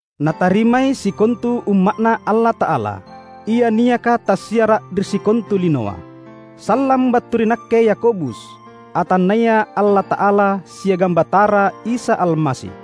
Natarimai sikontu Umma’Na Allata’ala, ia niaka tassiara’ ri sikontu linoa. Sallang battu ri nakke Yakobus, atanNaya Allata’ala siagang Batara Isa Almasi.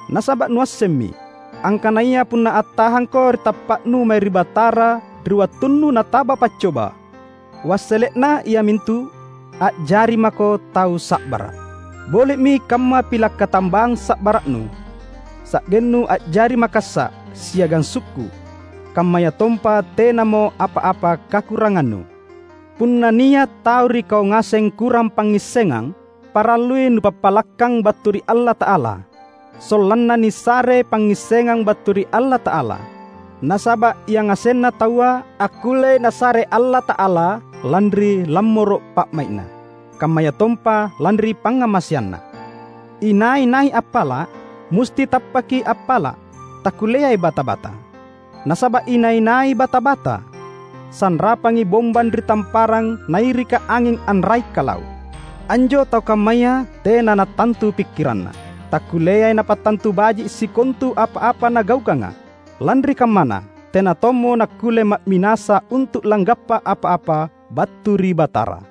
Nasaba’ nuassemmi, angkanaya punna attahangko ri tappa’nu mae ri Batara ri wattunnu nataba paccoba, wassele’na iamintu: a’jari mako tau sa’bara’. Boli’mi kamma pila’ katambang sa’bara’nu sa’gennu a’jari makassa’ siagang sukku’ kammayatompa tenamo apa-apa kakurangannu. Punna nia’ tau ri kau ngaseng kurang pangngissengang, parallui nupappalakkang battu ri Allata’ala, sollanna nisare pangngissengang battu ri Allata’ala; nasaba’ yangasenna taua akkullei Nasare Allata’ala lanri lammoro’ pa’mai’Na, kammayatompa lanri pangngamaseanNa. Inai-nai appala’, musti tappaki appala’; takkulleai bata-bata. Nasaba’ inai-nai bata-bata, sanrapangi bombang ri tamparang nairika anging anrai’-kalau’. Anjo tau kammaya tena nattantu pikkiranna; takkulleai napattantu baji’ sikontu apa-apa nagaukanga. Lanri kammana, tena tommo nakkulle ma’minasa untu’ langgappa apa-apa battu ri Batara.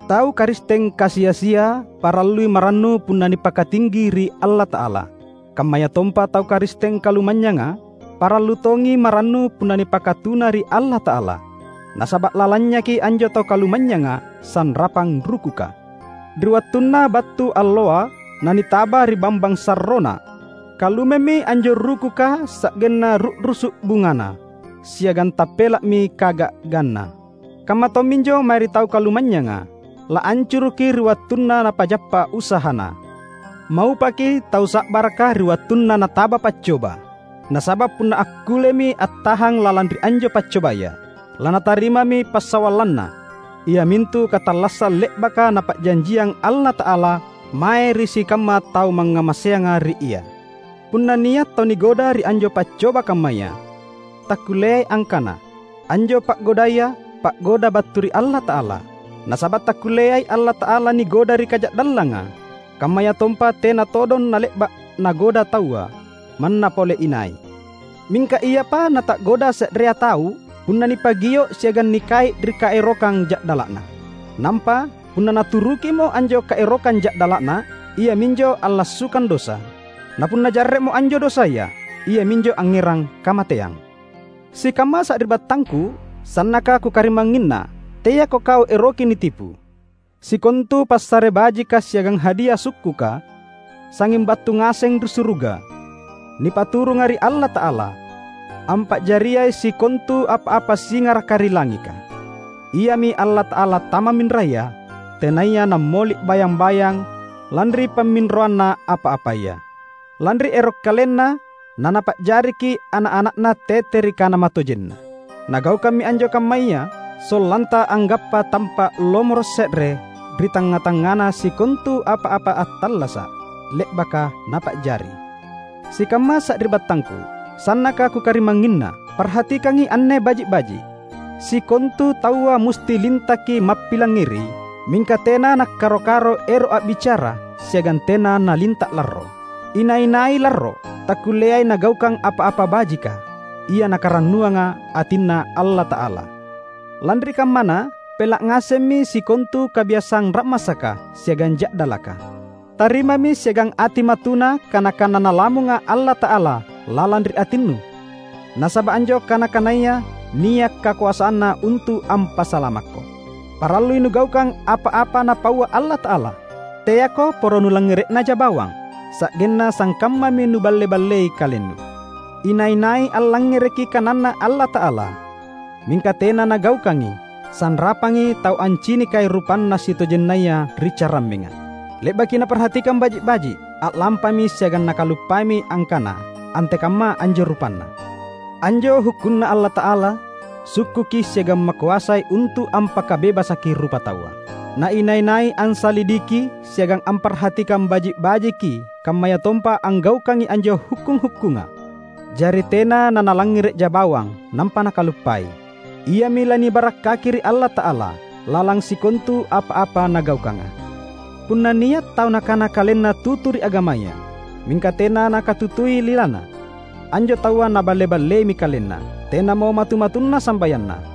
Tau Karisteng kasi-asia parallui marannu punna nipakatinggi ri Allata’ala. Kammayatompa tau Karisteng kalumanynyanga parallu tongi marannu punna nipakatuna ri Allata’ala. Nasaba’ lalanynyaki anjo tau kalumanynyanga sanrapang rukuka. Ri wattunna battu alloa nanitaba ri bambang sarrona, kalumemmi anjo rukuka sa’genna ru’rusu’ bungana siagang tappela’mi kaga’ganna. Kamma tomminjo mae ri tau kalumanynyanga: laancuruki ri wattunna napajappa usahana. Maupaki tau sa’baraka ri wattunna nataba paccoba. Nasaba’ punna akkullemi attahang lalang ri anjo paccobaya, lanatarimami passawallanna, iamintu katallassang le’baka Napa’janjiang Allata’ala mae ri sikamma tau mangngamaseanga ri Ia. Punna nia’ tau nigoda ri anjo paccoba kammaya, takkulleai angkana, "Anjo pa’godaya, pa’goda battu ri Allata’ala," nasaba’ takkulleai Allata’ala nigoda ri kaja’dallanga, kammayatompa tena todong nale’ba’ nagoda taua, manna pole inai. Mingka iapa nata’goda se’rea tau punna nipagio’ siagang nikai’ ri kaerokang ja’dala’na. Nampa, punna naturukimo anjo kaerokang ja’dala’na, iaminjo allassukang dosa; napunna jarre’mo anjo dosaya, iaminjo angngerang kamateang. Sikamma sari’battangku, sannaka kukarimangnginna; teako kau eroki nitipu! Sikontu passare bajika siagang hadia sukkuka, sangnging battu ngaseng ri suruga, nipaturunga ri Allata’ala, ampa’jariai sikontu apa-apa singaraka ri langika. Iami Allata’ala tamamminraya, tenaya Nammoli’ bayang-bayang lanri pamminroanna apa-apaya. Lanri ero’ KalenNa na Napa’jariki’ ana’-ana’na tete ri kana matojenNa. Nagaukammi anjo kammaya sollanta anggappa tampa’ lomoro’ se’re ri tangnga-tangngana sikontu apa-apa attallasa’ le’baka Napa’jari. Sikamma sari’battangku, sannaka kukarimangnginna! Parhatikangi anne baji’-baji’! Sikontu taua musti lintaki mappilangngeri, mingka tena nakkaro-karo ero’ a’bicara siagang tena nalinta’ larro. Inai-nai larro takkulleai nagaukang apa-apa bajika, ia nakarannuanga atinNa Allata’ala. Lanri kammana, pela’ ngasemmi sikontu kabiasang ra’masaka siagang ja’dalaka. Tarimami siagang ati matuna kana-kana Nalamunga Allata’ala lalang ri atinnu, nasaba’ anjo kana-kanaya nia’ kakoasanna untu’ ampasalamakko. Parallui nugaukang apa-apa Napaua Allata’ala; teako poro nullangngere’naja bawang, sa’genna sangkammami nuballe-ballei kalennu. Inai-nai allangngereki kananNa Allata’ala, mingka tena nagaukangi, sanrapangi tau ancinikai rupanna sitojennaya ri carammenga. Le’baki naparhatikang baji’-baji’, a’lampami siagang nakaluppaimi angkana antekamma anjo rupanna. Anjo hukkunNa Allata’ala sukkuki siagang makoasai untu’ ampakabebasaki rupataua. Na inai-nai ansalidiki siagang amparhatikang baji’-bajiki kammayatompa anggaukangi anjo hukkung-hukkunga, jari tena na nalangngere’ja bawang nampa nakuluppai, iami lanibarakkaki ri Allata’ala lalang sikontu apa-apa nagaukanga. Punna nia’ tau nakana kalenna tutu ri agamaya, mingka tena nakatutui lilana, anjo taua naballe-balleimi kalenna; tenamo matu-matunna sambayanna.